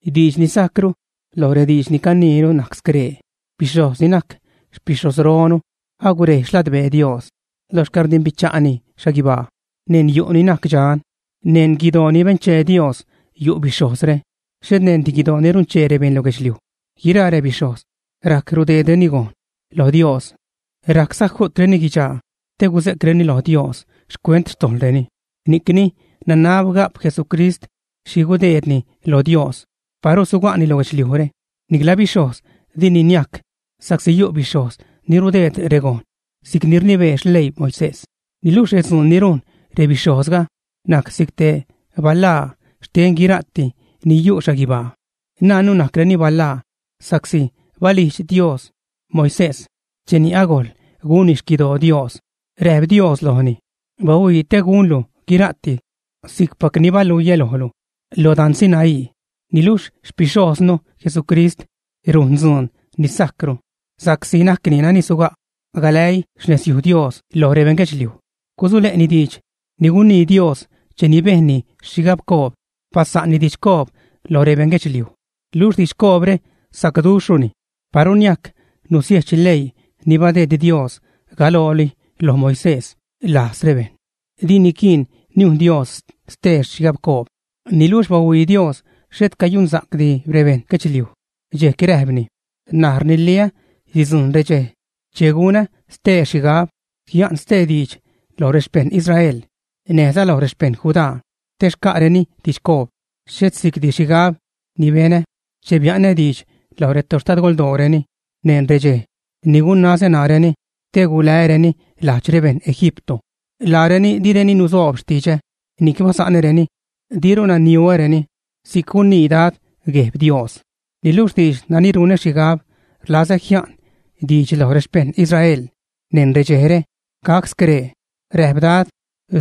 Diidx ni sajcru loj rediidx ni caniinu najc scree: bixhojz ni najc xpixhojzronu agurej xladbee Dios lo xcäḻrdimbicha'ni xhaguibaa. Neṉ yu' ni najc dxan, neṉ guidoo ni benchee Dios yu' bixhojzre, xhet neṉdi guidoo ni runchee rebeṉ lo guedxliuj. Guiraa rebixhojz rajc rudeedreni gojṉ lo Dios, rajcza ju'treni guidxaa te gusejcreni lo Dios xcuent xtojḻreni, ni'cni nanab ga'p Jesucrist xhi gudeedni lo Dios. Paru suga'ni lo guedxliujre, nicla bixhojz dini niajc, sa'csi yu' bixhojz ni rudeed regojṉ si'c ni rnibee xleii Moisés. Niluxh redzuun ni rujn rebixhojzga najc si'c te balaa xten guira'ti ni yu' xhaguibaa. Najnnu najcreni balaa sa'csi balijdx Dios Moisés cheni agojl gunni xquidoo Dios, räjp Dios lojni: “Bahuii te gunlu guira'ti si'cpac ni baluiä lojlu lo dan Sinaí.” Niluxh xpixhojznu Jesucrist rujn dzuun ni sajcru, sa'csi najcni nani suga' galäii xnezyuj Dios loj rebeṉ guedxliuj, gusule'ni diidx ni gunii Dios cheni bejnni xhigabcoob, basa'nni didxcoob loj rebeṉ guedxliuj. Luxh didxcoobre sacduxhruni. Paru niajc nusiejch leii ni badeed Dios galooli lo Moisés lajz rebejṉ, di niquiin niujn Dios ste xhigabcoob. Niluxh bahuii Dios xhet cayunsa'cdi rebeṉ guedxluij, dxejc räjpni: N̲aj rniliä sidzujṉ redxej che gunä stee xhigab, jia'n stee diidx loj rexpejṉ Israel näjza loj rexpejṉ Judá te xca'reni didxcoob. Xhet si'cdi xhigab ni benä che bia'nä diidx loj retoxtadgoldooreni neṉ redxej ni gunazä ṉaareni te gulää́reni lajdx rebeṉ Egipto. Laareni direni nusoob xtidxä ni'c basa'näreni, diruna niuäreni. Si'c gunii Dad, Gueb Dios. Niluxh diidx nani runä xhigab rlazä jia'n diidx loj rexpejṉ Israel neṉ redxejre gac scree, räjp Dad: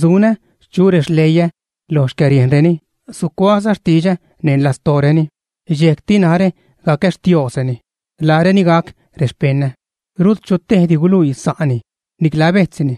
Sunä chu rexleiä lo xcäriejnreni, sucuaäza xtidxä neṉ lastooreni. Dxejcti narä gacä Xtiosreni, laareni gac rexpeṉä. Rut chu tejdi guluii sa'ni, nicla bejtzni,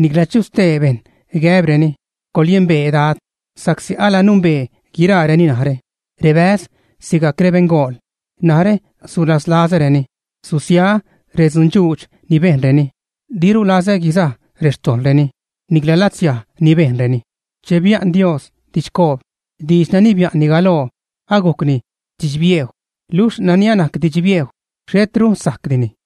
nicla chu stee bejṉ gäbreni, “coḻyembee Dad”, sa'csi alanumbee guiraareni narä, rebäz sigajc rebeṉgool. Narä sulaslazäreni susiaä redzundxuudx ni bejnreni, diru lazä guizaj rextojḻreni, nicla latzsiaj ni bejnreni. Che bia'n Dios didxcoob, diidx nani bia'nni galoo agujcni didx-biejw, luxh nani anajc didx-biejw, xhetru sajcdini.